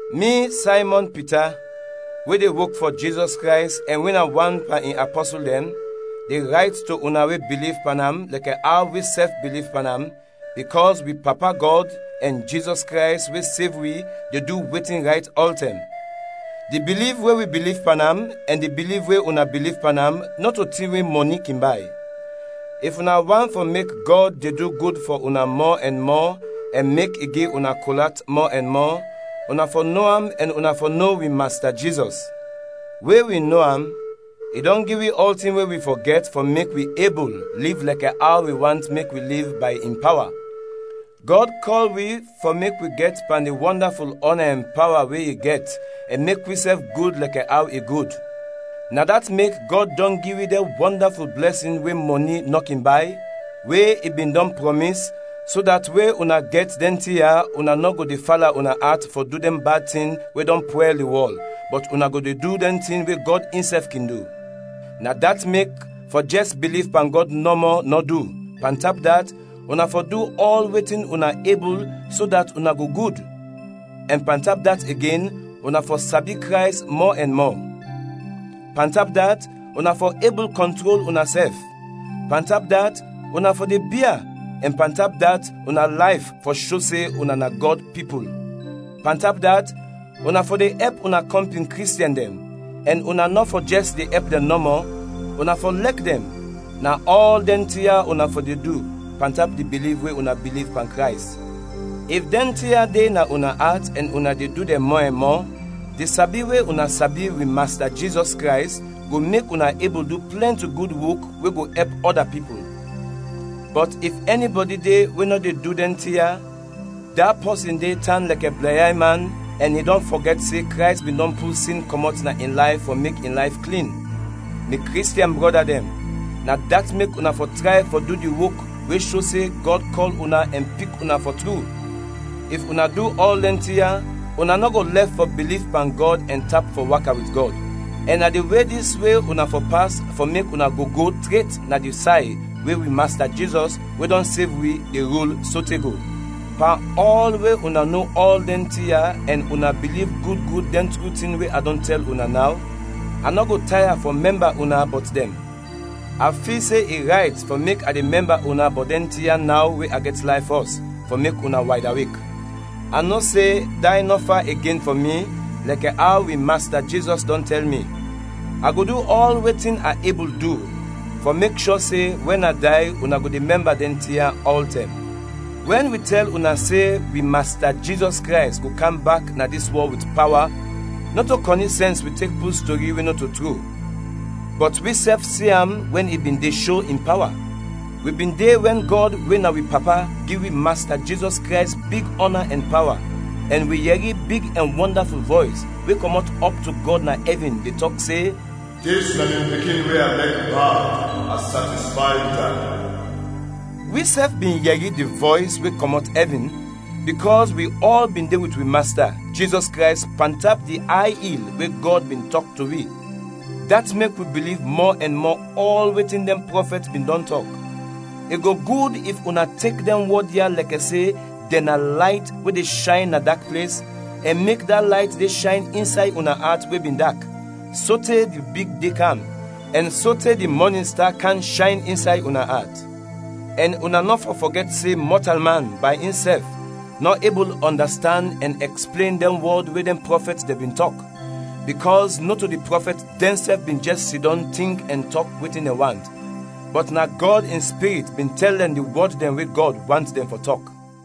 Mi Saymɔn Pita, we de wok fɔ Jizɔs Krays ɛn we na wan pan in apɔsul dɛn, de rayt to una we biliv pan am lɛkɛ aw wisɛf biliv pan am, bikɔs wi Papa Gɔd ɛn Jizɔs Krays we sev wi de du wetin rayt ɔltɛm. Di biliv we wi biliv pan am ɛn di biliv we una biliv pan am nɔto tin we mɔni kin bay. If una want fɔ mek Gɔd de du gud fɔ una mɔ ɛn mɔ ɛn mek i gi una kol at mɔ ɛn mɔ, una fɔ no am ɛn una fɔ no wi Masta Jizɔs. We wi no am, i dɔn gi wi ɔltin we wi fɔ gɛt fɔ mek wi ebul liv lɛkɛ aw i want mek wi liv bay in pawa. Gɔd kɔl wi fɔ mek wi gɛt pan di wɔndaful ɔna ɛn pawa we i gɛt ɛn mek wisɛf gud lɛkɛ aw i gud. Na dat mek Gɔd dɔn gi wi dɛn wɔndaful blɛsin we mɔni nɔ kin bay, we i bin dɔn prɔmis, so dat we una gɛt dɛn tin ya, una nɔ go de fala una at fɔ du dɛn bad tin we dɔn pwɛl di wɔl, bɔt una go du dɛn tin we Gɔd insɛf kin du. Na dat mek, fɔ jɛs biliv pan Gɔd nɔmɔ nɔ du, pantap dat, una fɔ du ɔl wetin una ebul so dat una go gud, ɛn pantap dat igen, una fɔ sabi Krays mɔ ɛn mɔ. Pantap dat, una fɔ ebul kɔntrol unasɛf; pantap dat, una fɔ de bia, ɛn pantap dat una layf fɔ sho se una na Gɔd pipul. Pantap dat, una fɔ de ɛp una kɔmpin Kristiɛn dɛn, ɛn una nɔ fɔ jɛs de ɛp dɛn nɔmɔ, una fɔ lɛk dɛn; na ɔl dɛn tin ya una fɔ de du pantap di biliv we una biliv pan Krays. If dɛn tin ya de na una at ɛn una de du dɛn mɔ ɛn mɔ, di sabi we una sabi wi Masta Jizɔs Krays go mek una ebul du plɛnti gud wok we go ɛp ɔda pipul. Bɔt if ɛnibɔdi de we nɔ de du dɛn tin ya, da pɔsin de tan lɛkɛ blɛnyay man ɛn i dɔn fɔgɛt se Krays bin dɔn pul sin kɔmɔt na in layf fɔ mek in layf klin. Mi Kristiɛn brɔda dɛn, na dat mek una fɔ tray fɔ du di wok we sho se Gɔd kɔl una ɛn pik una fɔ tru; if una du ɔl dɛn tin ya, una nɔ go lɛf fɔ biliv pan Gɔd ɛn tap fɔ waka wit Gɔd. Ɛn na di we dis we una fɔ pas fɔ mek una go go tret na di say we wi Masta Jizɔs, we dɔn sev wi, de rul sote go. Pan ɔl we una no ɔl dɛn tin ya ɛn una biliv gud gud dɛn tru tin, we a dɔn tɛl una naw, a nɔ go taya fɔ mɛmba una bɔt dɛn. A fil se i rayt fɔ mek a de mɛmba una bɔt dɛn tin ya naw we a gɛt layf fɔs, fɔ mek una waydawek. A no se day nɔ fa igen fɔ mi lɛkɛ aw wi Masta Jizɔs dɔn tɛl mi. A go du ɔl wetin a ebul du fɔ mek shɔ se wɛn a day, una go de mɛmba dɛn tin ya ɔltɛm. Wɛn wi tɛl una se wi Masta Jizɔs Krays go kam bak na dis wɔl wit pawa, nɔto kɔni sɛns wi tek pul stori we nɔto tru, bɔt wisɛf si am wɛn i bin de sho in pawa. Wi bin de wɛn Gɔd we na wi Papa gi wi Masta Jizɔs Krays big ɔna ɛn pawa, ɛn wi yɛri big ɛn wɔndaful vɔys, we kɔmɔt ɔp to Gɔd na ɛvin de tɔk se, “Dis na mi Pikin we a lɛk bad. A satisfay wit am.” Wisɛf bin yɛri di vɔys we kɔmɔt ɛvin, bikɔs wi ɔl bin de wit wi Masta, Jizɔs Krays pantap di ay il we Gɔd bin tɔk to wi. Dat mek wi biliv mɔ ɛn mɔ ɔl wetin dɛn prɔfɛt bin dɔn tɔk. I go gud if una tek dɛn wɔd ya lɛkɛ se dɛn na layt we de shayn na dak ples, ɛn mek da layt de shayn insay una at we bin dak, sote di big de kam, ɛn sote di mɔnin sta kam shayn insay una at. Ɛn una nɔ fɔ fɔgɛt se mɔtalman, bay insɛf, nɔ ebul ɔndastand ɛn ɛksplen dɛn wɔd we dɛn prɔfɛt dɛn bin tɔk, bikɔs nɔto di prɔfɛt dɛnsɛf bin jɛs sidɔm tink ɛn tɔk wetin dɛn want, bɔt na Gɔd in Spirit bin tɛl dɛn di wɔd dɛn we Gɔd want dɛn fɔ tɔk.